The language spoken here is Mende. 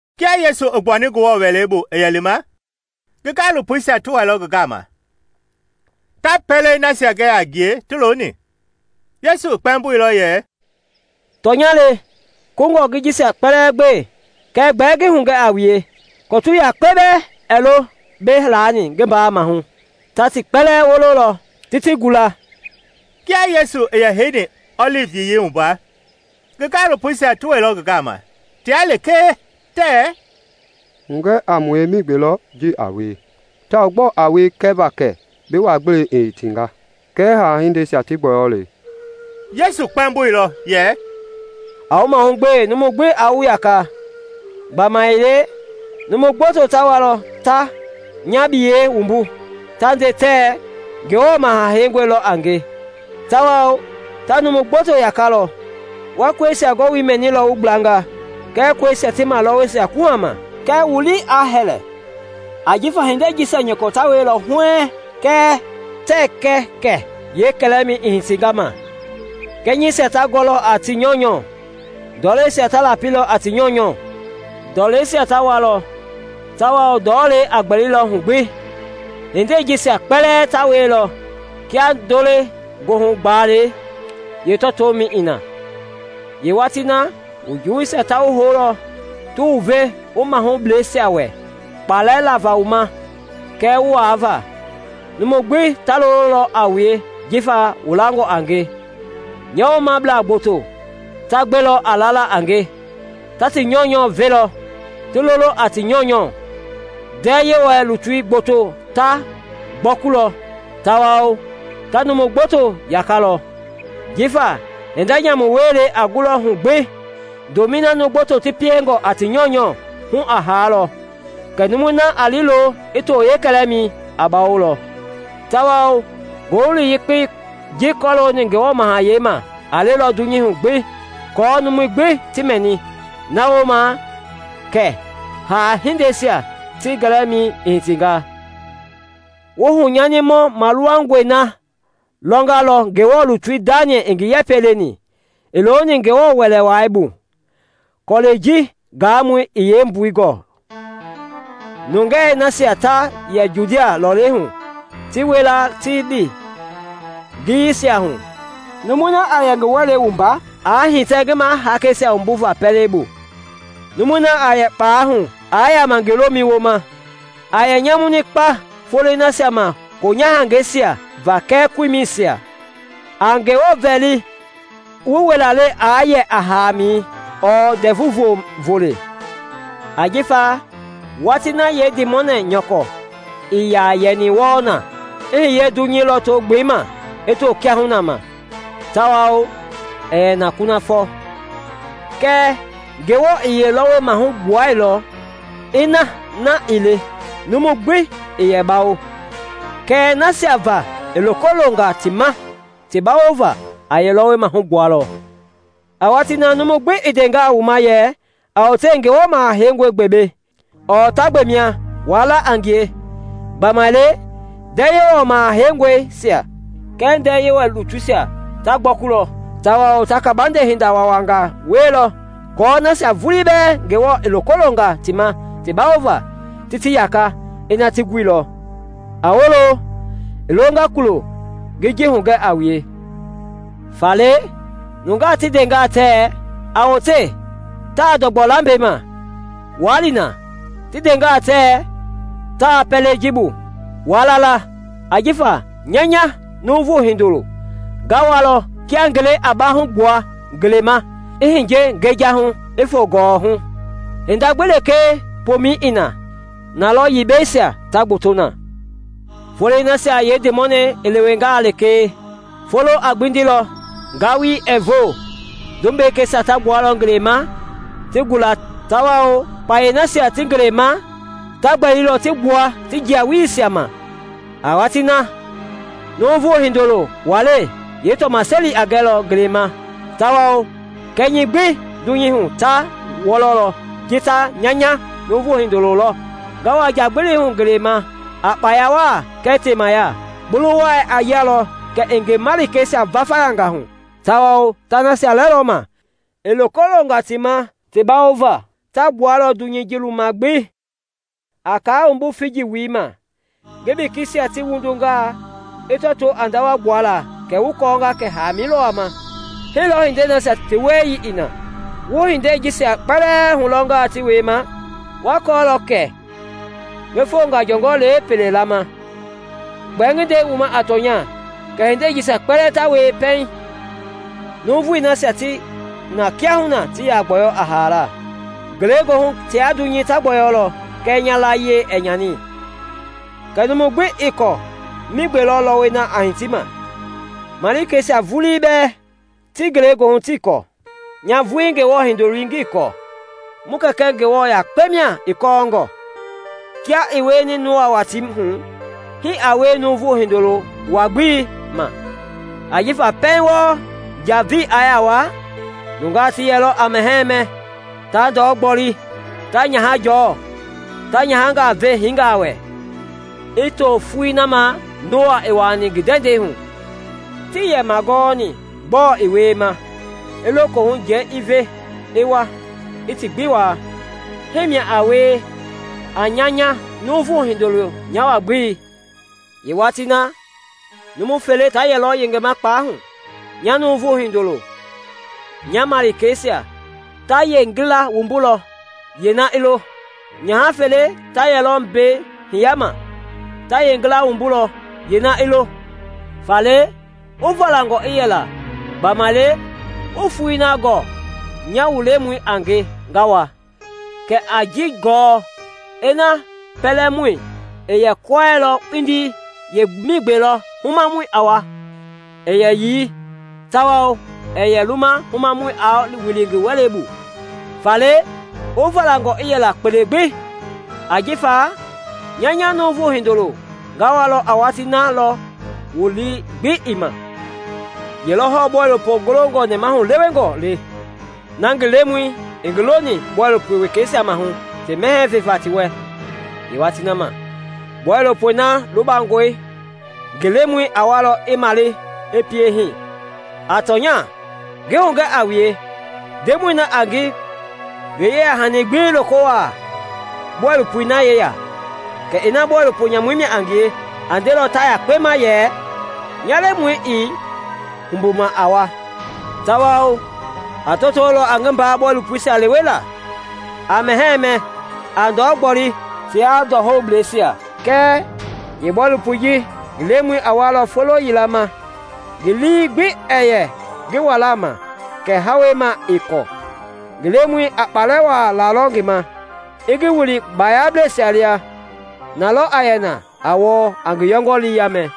Kia Yesu i gbuani Ngewɔ Wɛlei bu i yɛ lima, ngi gaalopoisia ti wailɔ ngi gama, ta pɛlei nasia gɛ a ngie ti looni. Yesu i kpɛmboilɔ yɛ, “Tɔnya le, kungɔi wu jisia kpɛlɛɛ gbe; kɛɛ gbɛɛ ngi hugɛ a wue, kɔtu yakpe bɛɛ ɛɛ lo mbei laani ngi mbaa maahu, ta ti kpɛlɛɛ wololɔ ti ti gula.” Kia Yesu i yɛ heini ɔlivi Yiyei wumba, ngi gaalopoisia ti wɛilɔ ngi gama, tia lekee, tɛɛ, “Hugɛ a mue migbe lɔ ji a wie tawao gbɔɔ a wie kɛva kɛ bi wa-gbelei i hitinga kɛɛ haa-hindeisia ti gbɔyɔlei.” Yesu kpɛmboilɔ yɛ, “A wu mahugbe numu gbi aa wu yaka. Gbamaile numu gboto ta walɔ ta nya biyei wumbu, ta nde tɛɛ, ‘Ngewɔ Maha Heingɔi lɔ a nge!’ tawao ta numu gboto yakalɔ. Wa kɔisia gɔwoi mɛnilɔ wu gblanga kɛɛ kɔisia ti malɔwɔi kuhama; kɛɛ wu lii aa hɛlɛ; ajifa hindei jisia nyɔkɔ ta wielɔ huɛɛŋ kɛɛ tɛɛ kɛ kɛ kɛlɛmɛi i hitinga ma. Kɛnyɛisia ta gɔlɔ a ti nyɔunyɔ, ndɔleisia ta lapi a ti nyɔunyɔ. Ndɔleisia ta walɔ tawao ndɔɔlei a gbɛlilɔ hu gbi; Hindei jisia kpɛlɛɛ ta wielɔ kia ndo-le-goohu-gbalei lɔtomɛi i na. “Yeewatii na, wu juwuisia ta wu houlɔ ti wu ve mahubleisia wɛ kpalɛ lava wu ma kɛɛ wu waava. Nuuvui gbi ta lololɔ a wue jifa wu langɔ a nge. Nya woomablaa gboto ta gbelɔ a lala a nge; ta ti nyɔunyɔ velɔ, ti lolo a ti nyɔunyɔ. Ndɛɛ Yewɔ lutui gboto ta gbɔkulɔ tawao ta numu gboto yakalɔ. Jifa hinda nyamu wielei a gulɔ hu gbi, ndomɛi na numu gboto ti piengɔ a ti nyɔunyɔ, hu a haalɔ. Kɛɛ numui na a liilo i to yeekɛlɛmɛi a bawolɔ. Tawao Ngowili Yekpei ji kɔlooni Ngewɔ Mahayɛi ma a lelɔ dunyei hu gbi aako numui gbi ti mɛni; na wooma kɛ haa-hindeisia ti gɛlɛmɛi i hitinga. “Wu hunyanimɔ maluwangɔi na lɔngalɔ Ngewɔ lutui Daniɛl i ngi yɛpɛ leni, i looni Ngewɔ Wɛlei Wai bu (kɔlɛi ji gaamɔi i ji yeembui gɔɔ), nungei nasia ta yɛ Judia lɔlei hu ti wila ti lɛ ngiyeisia hu. Numui na a yɛ ngi wɛlei wumba, aa hitɛ ngi mahaakeisia wumbuva pɛlei bu. Numui na a yɛ kpalɛi hu aa yaama ngi lomɛi wooma. A yɛ nyamuni kpa foloi nasia ma koonyahangɛisia va kɛɛ koimɛisia! A Ngewɔ vɛli wu wilalɛi aa yɛ a haamɛi ɔɔ Ndɛvu Volei. Ajifa watii na yeendimɔnɛi nyɔkɔ ii yaa yɛni wɔɔ na, i hiye dunyei lɔto-gbelei ma i to kiahuna ma, tawao ɛɛ yɛ na kunafɔ. Kɛɛ Ngewɔ i yeelɔwɔi maahu gbuanga; ina na ii le numu gbi ii yɛ bawo. Kɛɛ nasia va i loko longa ti ma ti bawova, a yeelɔwɔi maahu gbualɔ. “A watii na, numu gbi i ndengaa wu ma yɛ, ‘A wote, Ngewɔ Maha Heingɔi gbe mbei!’ ɔɔ ‘Ta gbe mia!’ waa la a ngie. Gbamaile ndɛɛ Yewɔ Maha Heingɔisia kɛɛ ndɛɛ Yewɔ lutuisia ta gbɔkulɔ tawao ta kabande hinda waawaangaa wielɔ aako nasia vulii bɛɛ Ngewɔ i loko longa ti ma ti bawova ti ti yaka, ina ti guilɔ. A wolo! I longa kulɔ ngi ji hugɛnga a wue. “Faale, nungaa ti ndengaa tɛɛ, ‘A wote, taa ndɔgbɔ lambɛi ma!’ waa li na; ti ndengaa tɛɛ, ‘Taa pɛlei ji bu!’ waa la la. Ajifa nya nya Nuuvu Hindoloi nga walɔ kia ngelei a baahugbua ngelei ma i hiye ngejahu i foo gɔwɔhu. “Hinda gbi lekee pomɛi i na, na lɔ yibɛisia ta gbɔtɔ na. “Foloi nasia yeendimɔnɛi i lewengaa lekee, foloi a gbindilɔ, ngalui ɛɛ voo; tumbekeisia ta gbualɔ ngelei ma ti gula tawao kpayei nasia ti ngelei ma ta gbɛlilɔ ti gbua ti jia-weleisia ma. A watii na, Nuuvu Hindoloi walei yeetɔmaseli a gɛlɔ ngelei ma tawao kɛnyɛi gbi dunyei hu ta wɔlɔ ji ta nya nya Numu Hindoloi lɔ nga wa njagbili hu ngelei ma a kpaya waa kɛɛ temaya. Bulu wai a yialɔ kɛ i ngi malikeisia vayanga hu tawao ta nasia lɛlɔ ma i loko longa ti ma ti bawova ta gbua dunyei luwuma gbi. “A kaa wumbu figi wulii ma; ngi bekeisia ti wundungaa, i tɔtoo a ndawa gbuala kɛ wu kɔɔnga kɛ haamɛi lɔ wama. Hii lɔɔ hindei na wieyii i na, wu hindei jisia kpɛlɛɛ lɔnga ti wiema, wa kɔɔlɔ kɛ ngi fongɔ jɔngɔ le pɛlei laama. Gbɛɛ ngi nde wu ma a tɔnya kɛ hindei jisia kpɛlɛɛ ta wie pɛiŋ nuuvui nasia ti na kiahuna ti yaa gbɔyɔ a haala. Ngelegoohu tia dunyei ta gbɔyɔlɔ kɛɛ nya layie ɛɛ nyani. “Kɛɛ numu gbi ii kɔɔ migbe lɔ lɔwɔi na a hiti ma, malikeisia vulii bɛɛ ti ngelegoohu tii kɔɔ; nya nya Ngewɔ Hindoloi ngii kɔɔ, mu Kɛkɛ Ngewɔ yakpe mia i kɔɔngɔ. Kia i wieni Noa watii hu, hii a wie Nuuvu Hindoloi wa-gbelei ma. Ajifa pɛiŋ wɔɔ njavei i yaa waa, nungaa ti yɛlɔ a mɛhɛɛ mɛ, ta ndɔ gboli, ta nyahangaa jɔɔ, ta nyahangaa ve hiingaa wɛ, i to foloi na ma Noa i wuaani ndɛndɛi hu. Tii yɛ magɔni gbɔɔ i wiema i lohu njavei i wa i ti gbi waa. Hii mia a wie a nya nya Nuuvu Hindoloi nya wa-gbelei. Yeewatii na, numu fele ta yɛlɔ yengema kpalɛi hu; nya Nuuvu Hindoloi nya malikeisia ta yeengila wumbulɔ, yeena i lo. Nyaha fele ta yɛlɔ mbei hiyama; ta yeengila wumbulɔ, yeena i lo. Faale, wu valangɔ i yɛla, gbamaile wuii foloi na gɔɔ nya wu Lemɔi a nge nga wa. Kɛɛ a ji gɔɔ, ina pɛlɛmɔi i yɛ kɔɛilɔ kpindi yeemigbe lɔ humamɔi i wama, ii yɛ yii tawao ii yɛ luma humamɔi aa wili pɛlei bu. Faale wu valangɔ i yɛla kpele gbi, ajifa nya nya Nuuvu Hindoloi nga wa a watii na lɔ wu lii gbi ii ma. “Ye lɔ hɔɔ bɔilopo golongɔ nɛmahulewengɔi le, na ngi lemɔi i ngi loni bɔilopo wekeisia maahu ti mɛhɛɛ veva ti wɛ yeewatii ma. Bɔilopoi na lubangɔe ngi lemɔi a wa i male i piema hii. A tɔnya, ngi hugɛ a wue, ndemɔi na a ngi yeyahani gbi loko wuaalɔ bɔilopoi na yeya. Kɛɛ ina bɔilopo nyamu mia a ngie, a ndelɔ ta yekpe ma yɛ, ‘Nya lemɔi ii humbuma a wa,’ tawao a tɔtolɔ a ngi mbaa bɔilopoisia lewela, a mɛhɛɛ mɛ, a ndɔ gboli tia ndɔhoubleisia. Kɛɛ yeebɔilopoi ji ngi lemɔi a walɔ folo yila ma ngi lii gbi ɛɛ yɛ ngi walaa ma kɛɛ hawei ma ii kɔɔ. Ngi lemɔi a kpalɛ waa lalɔ ngi ma, i ngi wili baayablɛisia li a. Na lɔ a yɛ na a wɔɔ, a ngi yɔngɔlii yaamɛ.